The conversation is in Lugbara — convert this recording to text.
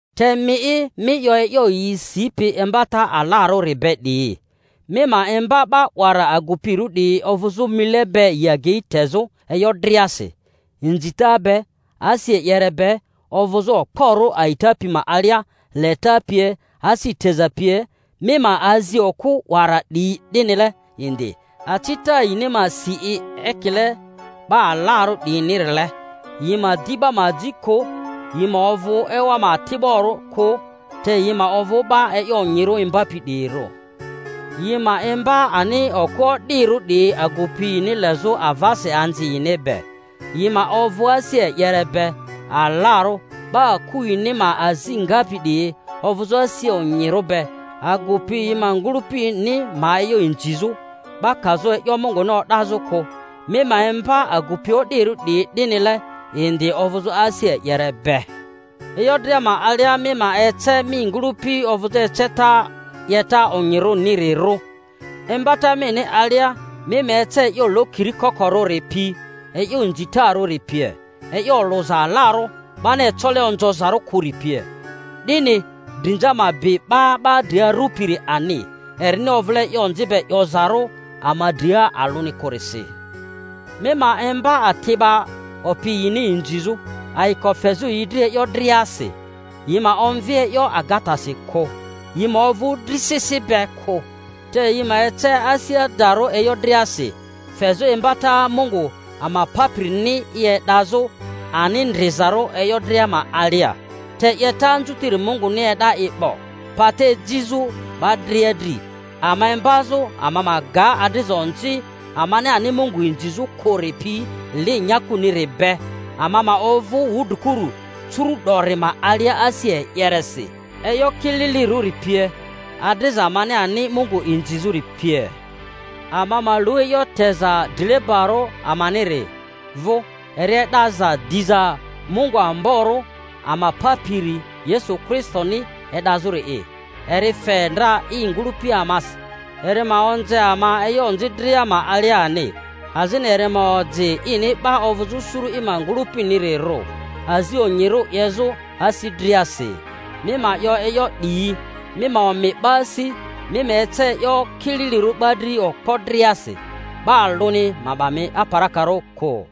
Te mi'i, mi 'yo e'yo yi sipi imbata alarᴜri be 'diyi. Mi ma imba 'ba 'wara agupirᴜ 'diyi ovᴜzᴜ mile be yi agei tezᴜ e'yo driasi, inzita be, asi e'yere be, ovᴜzᴜ okporᴜ a'ita pi ma alia, leta pie, asi teza pie. Mi ma azi okᴜ 'wara 'diyi 'dinile indi, acita yini ma si i ekile 'ba alarᴜ 'diyinirile, yi ma di 'ba ma aji kᴜ, yi ma ovᴜ ewa ma ati'barᴜ kᴜ; te yi ma ovᴜ 'ba e'yo onyirᴜ imbapi 'diyirᴜ, yi ma imba ani okᴜ o'dirᴜ 'diyi agupi yini lezᴜ avasi anzi yini be, yi ma ovᴜ asi e'yere be, alarᴜ, 'ba aku yini ma azi ngapi 'diyi, ovᴜzᴜ asi onyirᴜ be, agupi yi ma ngᴜlᴜpini ma e'yo inzizᴜ, 'ba kazᴜ e'yo Munguni o'dazᴜ kᴜ. Mi ma imba agupi o'dirᴜ 'diyi 'dinile indi ovᴜzᴜ asi e'yere be. E'yo dria ma alia mi ma ece mi ngᴜlᴜpi ovᴜzᴜ eceta 'yeta onyirᴜnirirᴜ, imbata mini alia mi ma ece e'yo lokiri kokorᴜri pi, e'yo inzitarᴜri pie, e'yo olᴜza alarᴜ 'bani ecole onzozarᴜ kᴜri pie, 'dini drinza ma bi 'ba 'ba dri arupiri ani, erini ovᴜle e'yo onzi be 'yozarᴜ ama dria alᴜni kᴜrisi. Mi ma imba ati'ba opi yini inzizᴜ, ayiko fezᴜ yi dri e'yo driasi; yi ma omvi e'yo agatasi kᴜ, yi ma ovᴜ drisisi be kᴜ, te yi ma ece asi adarᴜ e'yo driasi, fezᴜ imbata Mungu ama Papirini i e'dazᴜ ani ndrizarᴜ e'yo dria ma alia. Te 'yeta anzutiri Munguni e'da i 'bo, pata ejizᴜ 'ba dria dri, ama imbazᴜ ama ma ga adriza onzi amani ani Mungu inzizᴜ kᴜri pi, li nyakuniri be, ama ma ovᴜ wudrikuru curu'dori ma alia asi e'yeresi, e'yo kililirᴜri pie, adriza amani ani Mungu inzizᴜri pie; ama ma lu e'yo teza drilebarᴜ amaniri vᴜ, eri e'daza diza Mungu amborᴜ ama Papiri Yesu Kristoni e'dazᴜri'i; eri fe ndra i ngᴜlᴜpi amasi, eri ma onze ama e'yo onzi dria ma alia ani, azini eri ma oji ini 'ba ovᴜzᴜ suru i ma ngᴜlᴜpinirirᴜ, azi onyirᴜ 'yezᴜ asi driasi. Mi ma 'yo e'yo 'diyi; mi ma omi 'ba asi, mi ma ece e'yo kililirᴜ 'ba dri okpo driasi. 'Ba alᴜni ma 'ba mi aparakarᴜ kᴜ.